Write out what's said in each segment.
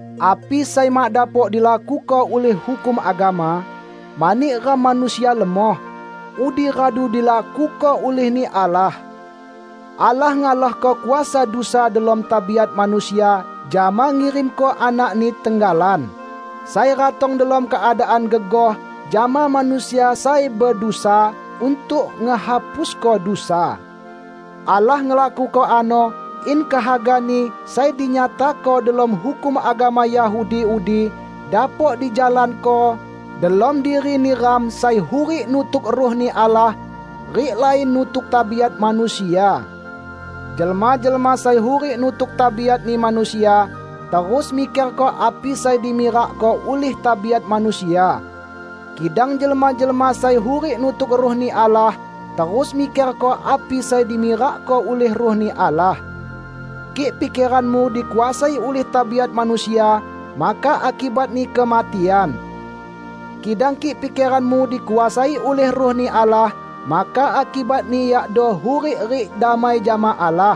Api sai mak dapok dilakuko ulih hukum agama, mani ram manusia lemoh, udi radu dilakuko ulih-Ni Allah. Allah ngalahko kuasa dusa delom tabiat manusia jama ngirimko Anak-Ni tenggalan, sai ratong delom keadaan gegoh jama manusia sai bedusa, untuk ngehapusko dusa. Allah ngelakuko ano in kehaga-Ni sai dinyatako delom hukum agama Yahudi udi dapok dijalanko delom diri neram sai hurik nutuk Ruh-Ni Allah rik lain nutuk tabiat manusia. Jelma-jelma sai hurik nutuk tabiatni manusia, terus mikerko api sai dimirakko ulih tabiat manusia. Kidang jelma-jelma sai hurik nutuk Ruh-Ni Allah, terus mikerko api sai dimirakko ulih Ruh-Ni Allah. Kik pikeranmu dikuasai ulih tabiat manusia, maka akibatni kematian. Kidang kik pikeranmu dikuasai ulih Ruh-Ni Allah, maka akibatni yakdo hurik rik damai jama Allah.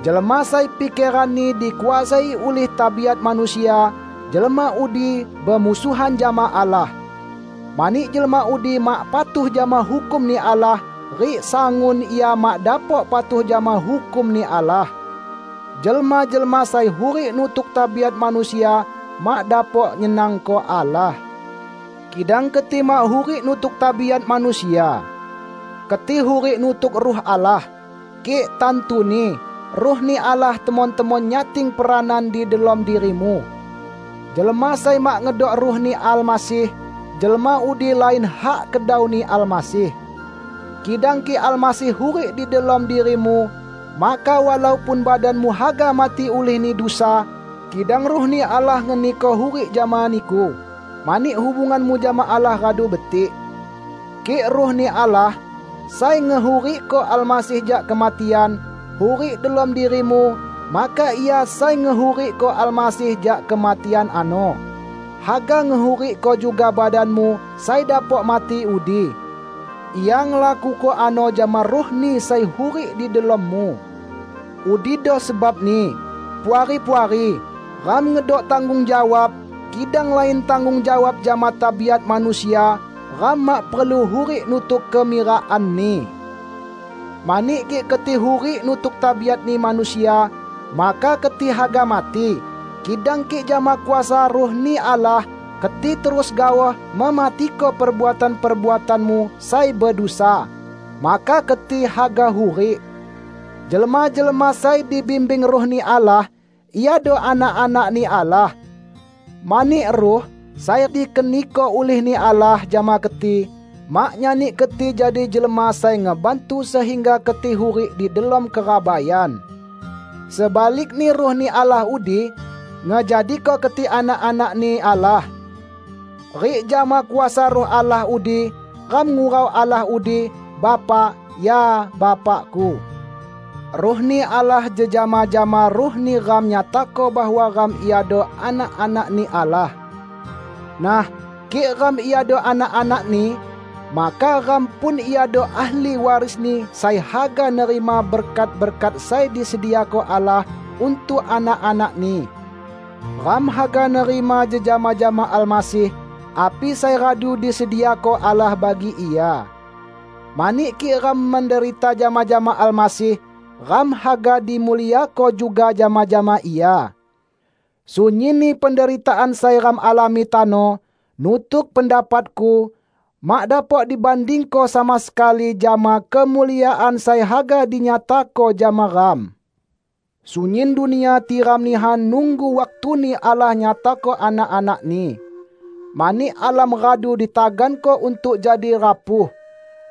Jelma sai pikeranni dikuasai ulih tabiat manusia, jelma udi bemusuhan jama Allah; mani jelma udi mak patuh jama hukum-Ni Allah; rik sangun ia mak dapok patuh jama hukum-Ni Allah. Jelma-jelma sai hurik nutuk tabiat manusia, mak dapok nyenangko Allah. Kidang keti mak hurik nutuk tabiat manusia. Keti hurik nutuk Ruh Allah -- kik, tantuni, Ruh-Ni Allah temon-temon nyating peranan di delom dirimu. Jelma sai mak ngedok Ruh-Ni Almasih, jelma udi lain hak kedauni Almasih. Kidang kik Almasih hurik di delom dirimu, maka walaupun badanmu haga mati ulihni dusa, kidang Ruh-Ni Allah ngeniko hurik jama niku, mani hubunganmu jama Allah radu betik. Kik Ruh-Ni Allah, sai ngehurikko Almasih jak kematian, hurik delom dirimu, maka Ia sai ngehurikko Almasih jak kematian ano, haga ngehurikko juga badanmu sai dapok mati udi. Ia ngelakuko ano jama Ruh-Ni sai hurik di delommu. Udido sebabni, Puari-puari, ram ngedok tanggung jawab; kidang lain tanggung jawab jama tabiat manusia; ram mak perlu hurik nutuk kemirakanni. Mani kik keti hurik nutuk tabiatni manusia, maka keti haga mati; kidang kik jama kuasa Ruh-Ni Allah, keti terus gaoh mematiko perbuatan-perbuatanmu sai bedusa, maka keti haga hurik. Jelma-jelma sai dibimbing Ruh-Ni Allah, iado anak-anak-Ni Allah. Mani Ruh, sai dikeniko ulih-Ni Allah jama keti, mak nyani keti jadi jelma sai ngebantu sehingga keti hurik di delom kerabaian. Sebalikni Ruh-Ni Allah udi ngejadiko keti anak-anak-Ni Allah. Rik jama kuasa Ruh Allah udi ram ngurau Allah udi, "Bapa, ya Bapaku!" Ruh-Ni Allah jejama jama ruh neram nyatako bahwa ram iado anak-anak-Ni Allah. Nah, kik ram iado anak-anak-Ni, maka ram pun iado ahli waris-Ni sai haga nerima berkat-berkat sai disediako Allah untuk anak-anak-Ni. Ram haga nerima jejama jama Almasih api sai radu disediako Allah bagi Ia; mani kik ram menderita jama-jama Almasih, ram haga dimuliako juga jama-jama Ia. Sunyinni penderitaan sai ram alami tano, nutuk pendapatku, mak dapok dibandingko sama sekali jama kemuliaan sai haga dinyatako jama ram. Sunyin dunia tiram nihan nunggu waktuni Allah nyatako anak-anak-Ni. Mani alam radu ditaganko untuk jadi rapuh,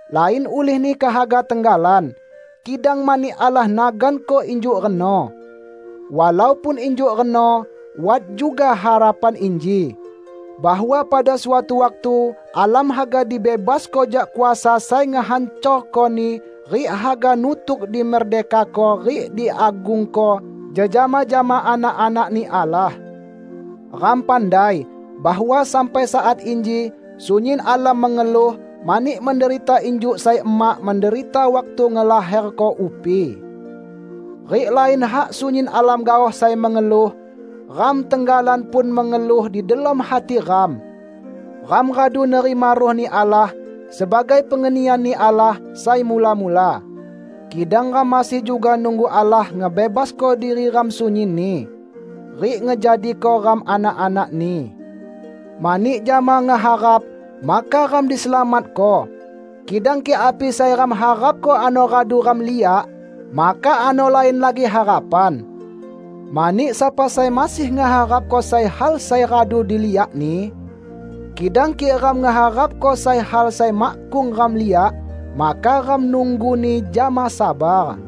lain ulihni kehaga tenggalan, kidang mani Allah naganko injuk reno. Walaupun injuk reno wat juga harapan inji: bahwa pada suatu waktu alam haga dibebasko jak kuasa sai ngehancorkoni rik haga nutuk dimerdekako rik diagungko jejama jama anak-anak-Ni Allah. Ram pandai bahwa sampai saat inji sunyin alam mengeluh mani menderita injuk sai emak menderita waktu ngelaherko upi. Rik lain hak sunyin alam gaoh sai mengeluh; ram tenggalan pun mengeluh di delom hati ram. Ram radu nerima Ruh-Ni Allah sebagai pengenian-Ni Allah sai mula-mula, kidang ram masih juga nunggu Allah ngebebasko diri ram sunyinni rik ngejadiko ram anak-anak-Ni. Mani jama ngeharap, maka ram diselamatko. Kidang kik api sai ram harapko ano radu ram liak, maka ano lain lagi harapan. Mani sapa sai masih ngeharapko sai hal sai radu diliakni? Kidang kik ram ngeharapko sai hal sai makkung ram liak, maka ram nungguni jama sabar.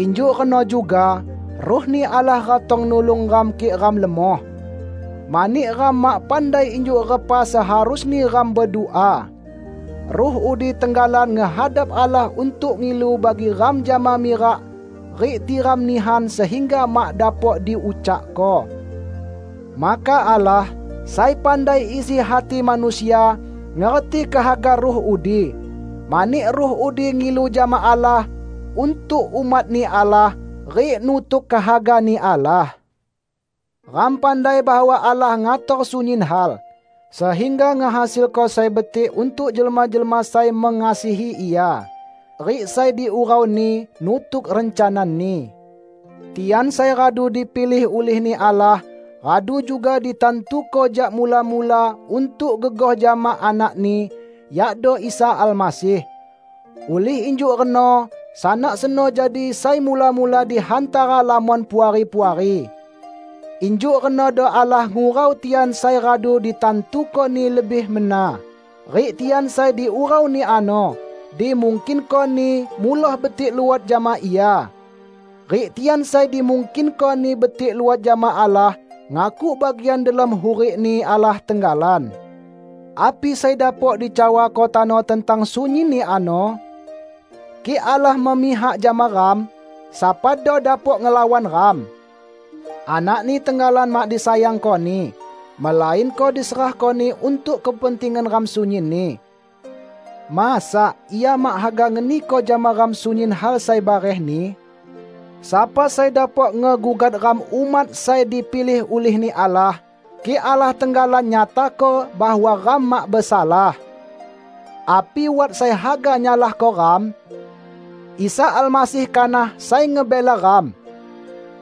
Injuk reno juga Ruh-Ni Allah ratong nulung ram kik ram lemoh. Mani ram mak pandai injuk repa seharusni ram bedua; Ruh udi tenggalan ngehadap Allah untuk ngilu bagi ram jama mirak rik tiram nihan sehingga mak dapok diucakko. Maka Allah, sai pandai isi hati manusia, ngerti kehaga Ruh udi; mani Ruh udi ngilu jama Allah untuk umat-Ni Allah, rik nutuk kehaga-Ni Allah. Ram pandai bahwa Allah ngator sunyin hal, sehingga ngehasilko sai betik untuk jelma-jelma sai mengasihi Ia rik sai diurau-Ni nutuk rencana-Ni. Tian sai radu dipilih ulih-Ni Allah, radu juga ditantuko jak mula-mula untuk gegoh jama anak-Ni, yakdo Isa Almasih. Ulih injuk reno Sanak seno jadi sai mula-mula di hantara lamon puari-puari. Injuk renodo Allah ngurau tian sai radu ditantuko-Ni lebih mena; rik tian sai diurau-Ni ano, dimungkinko-Ni muloh betik luot jama Ia. Rik tian sai dimungkinko-Ni betik luot jama Allah, ngakuk bagian delom hurik-Ni Allah tenggalan. Api sai dapok dicawako tano tentang sunyinni ano? Kik Allah memihak jama ram, sapado dapok ngelawan ram? Anak-Ni tenggalan mak disayangko-Ni, melainko diserahko-Ni untuk kepentingan ram sunyinni; masa Ia mak haga ngeniko jama ram sunyin hal sai barehni? Sapa sai dapok ngegugat ram umat sai dipilih ulih-Ni Allah, kik Allah tenggalan nyatako bahwa ram mak besalah? Api wat sai haga nyalahko ram? Isa Almasih kanah sai ngebela ram!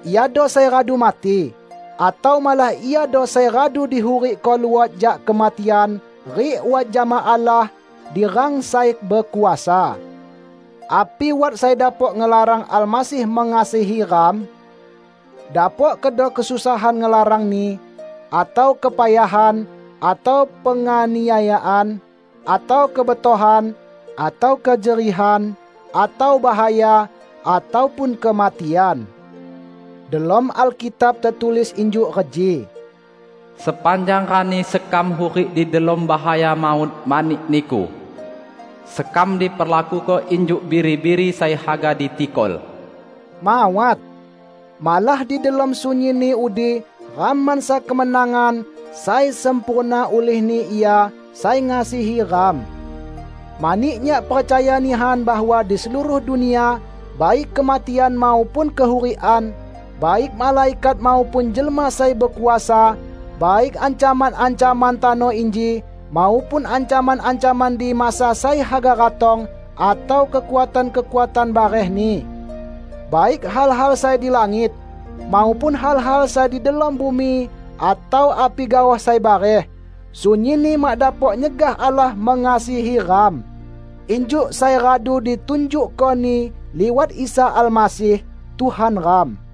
Iado sai radu mati, atau malah Iado sai radu dihurikko luot jak kematian rik wat jama Allah di rang sai bekuasa. Api wat sai dapok ngelarang Almasih mengasihi ram? Dapok kedo kesusahan ngelarangni, atau kepayahan, atau penganiayaan, atau kebetohan, atau kejerihan, atau bahaya, ataupun kematian? Delom Alkitab tetulis injuk reji, "Sepanjang rani sekam hurik di delom bahaya maut mani Niku. Sekam diperlakuko injuk biri-biri sai haga ditikol." Mawat! Malah di delom sunyinni udi ram mansa kemenangan sai sempurna ulih-Ni Ia sai ngasihi ram! Mani nyak percaya nihan bahwa di seluruh dunia, baik kematian maupun kehurikan, baik malaikat maupun jelma sai bekuasa, baik ancaman-ancaman tano inji maupun ancaman-ancaman di masa sai haga ratong atau kekuatan-kekuatan barehni; baik hal-hal sai di langit, maupun hal-hal sai di delom bumi atau api gaoh sai bareh, sunyinni mak dapok nyegah Allah mengasihi ram, injuk sai radu ditunjukko-Ni liwat Isa Almasih, Tuhan ram.